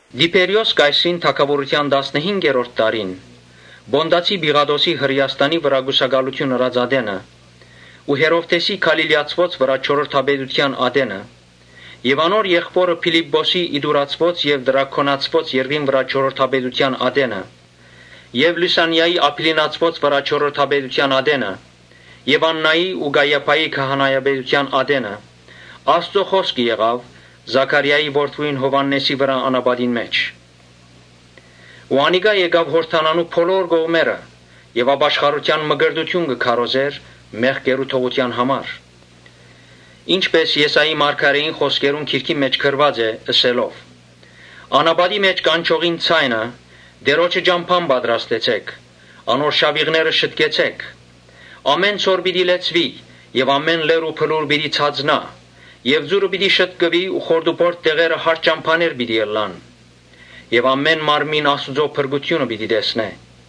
Տիբերիոս կայսրին թագաւորութեան տասնըհինգերորդ տարին, Պոնտացի Պիղատոսին Հրէաստանի վրայ կուսակալութիւն ըրած ատենը ու Հերովդէսին Գալիլիացիներուն վրայ չորրորդապետութեան ատենը եւ անոր եղբօրը Փիլիպպոսին Իտուրացիներուն եւ Տրաքոնացիներուն երկրին վրայ չորրորդապետութեան ատենը եւ Լիւսանիային Աբիլինացիներուն վրայ չորրորդապետութեան ատենը Եւ Աննային ու Կայիափային քահանայապետութեան ատենը Աստուծոյ խօսքը եղաւ Զաքարիային որդիին Յովհաննէսին անապատին մէջ։ Անիկա եկաւ Յորդանանի բոլոր կողմերը եւ ապաշխարութեան մկրտութիւն կը քարոզէր մեղքերու թողութեան համար. Ինչպէս Եսայի մարգարէին գրքին մէջ գրուած է՝ ըսելով. «Անապատին մէջ կանչողին ձայնը, Տէրոջը ճամբան պատրաստեցէք, անոր շաւիղները շտկեցէք։ Ամէն ձոր պիտի լեցուի եւ ամէն լեռ ու բլուր պիտի ցածնայ եւ ծուռը պիտի շտկուի ու խորտուբորտ տեղերը հարթ ճամբաներ պիտի ըլլան։ Եւ ամէն մարմին Աստուծոյ փրկութիւնը պիտի տեսնէ»։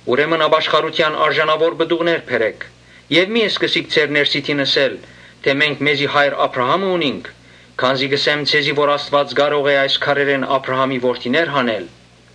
Ուրեմն ապաշխարութեան արժանաւոր պտուղ բերէք եւ մի՛ սկսիք ձեր ներսիդին ըսել թէ՝ ‘Մենք մեզի հայր Աբրահամը ունինք’, քանզի կ’ըսեմ ձեզի թէ Աստուած կարող է այս քարերէն Աբրահամի որդիներ հանել։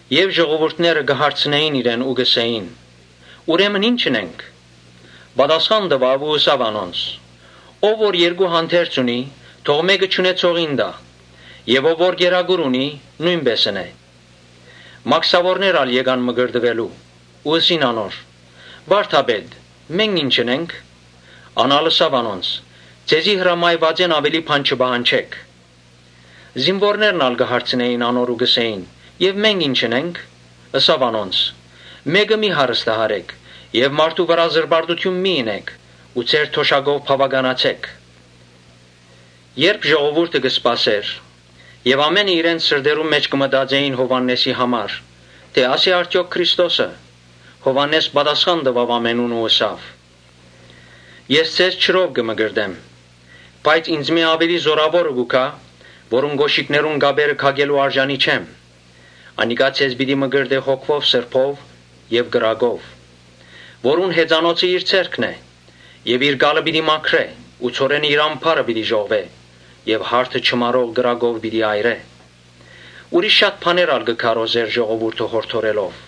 Եւ ժողովուրդները կը հարցնէին իրեն ու կ’ըսէին. «Ուրեմն ի՞նչ ընենք»։ Պատասխան տուաւ ու ըսաւ անոնց. «Ով որ երկու հանդերձ ունի, թող մէկը չունեցողին տայ եւ ով որ կերակուր ունի, նոյնպէս ընէ»։ Մաքսաւորներ ալ եկան մկրտուելու ու ըսին անոր. «Վա՛րդապետ, մե՞նք ինչ ընենք»։ Ան ալ ըսաւ անոնց. «Ձեզի հրամայուածէն աւելի բան մի պահանջէք»։ Զինուորներն ալ կը հարցնէին անոր ու կ’ըսէին. «Մե՞նք ինչ ընենք»։ Ըսաւ անոնց. «Մէկը մի՛ հարստահարէք. եւ մարդու վրայ զրպարտութիւն մի՛ ընէք ու ձեր թոշակով բաւականացէք»։ Երբ ժողովուրդը կը սպասէր եւ ամէնքը իր սրտերնուն մէջ կը մտածէին Յովհաննէսին համար՝ թէ ‘Ա՞ս է արդեօք Քրիստոսը’, Յովհաննէս պատասխան տուաւ ամենուն ու ըսաւ. «Ես ձեզ ջրով կը մկրտեմ, բայց ինծմէ աւելի զօրաւորը պիտի գայ, որուն կօշիկներուն կապերը քակելու արժանի չեմ, անիկա ձեզ պիտի մկրտէ Սուրբ Հոգիով եւ կրակով. Որուն հեծանոցը իր ձեռքն է եւ իր կալը պիտի մաքրէ ու ցորենը իր ամբարը պիտի ժողվէ եւ յարդը չմարող կրակով պիտի այրէ»։ Ուրիշ շատ բաներ ալ կը քարոզէր՝ ժողովուրդը յորդորելով։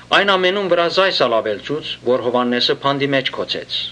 Այն ամենուն վրայ այս ալ աւելցուց, որ Յովհաննէսը բանտարկեց։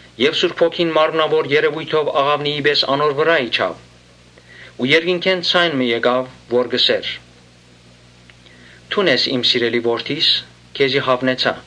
Եւ Սուրբ Հոգին մարմնաւոր երեւոյթով աղաւնիի պէս անոր վրայ իջաւ ու երկնքէն ձայն մը եկաւ, որ կ’ըսէր. «Դուն ես իմ սիրելի Որդիս, քեզի հաւնեցայ»։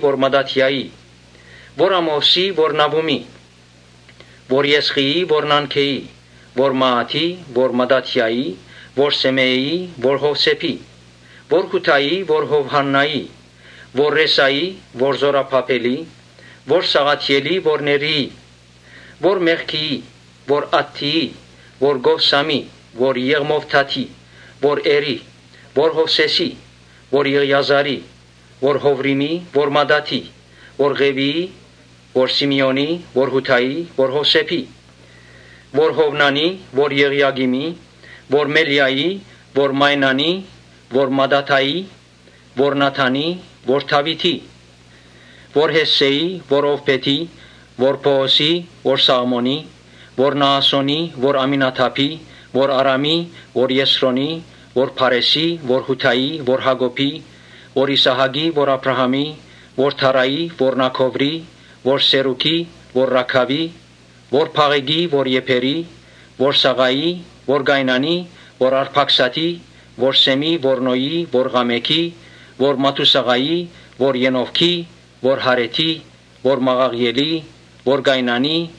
Որ Մատաթիայի, որ Ամովսի, որ Նաւումի, որ Եսղիի, որ Նանգէի, Որ Մաաթի, որ Մատաթիայի, որ Սէմէիի, որ Յովսէփի, որ Յուդայի, Որ Յովհաննայի, որ Րեսայի, որ Զօրաբաբէլի, որ Սաղաթիէլի, որ Ներիի, Որ Մեղքիի, որ Ադդիի, որ Կովսամի, որ Եղմովդադի, որ Էրի, Որ Յովսէսի, որ Եղիազարի, որ Յովրիմի, որ Մատաթի, որ Ղեւիի, Որ Սիմէոնի, որ Յուդայի, որ Յովսէփի, որ Յովնանի, որ Եղիակիմի, Որ Մելիայի, որ Մայնանի, որ Մատաթայի, որ Նաթանի, որ Դաւիթի, Որ Յեսսէի, որ Ովբէթի, որ Բոոսի, որ Սաղմոնի, որ Նաասոնի, Որ Ամինադաբի, որ Արամի, որ Եսրոնի, որ Փարէսի, որ Յուդայի, Որ Յակոբի, որ Իսահակի, որ Աբրահամի, որ Թարայի, որ Նաքովրի, Որ Սերուգի, որ Ռագաւի, որ Փաղէկի, որ Եբերի, որ Սաղայի, Որ Կայնանի, որ Արփաքսադի, որ Սէմի, որ Նոյի, որ Ղամէքի, Որ Մաթուսաղայի, որ Ենովսի, որ Յարեդի, որ Մաղաղիէլի, որ Կայնանի,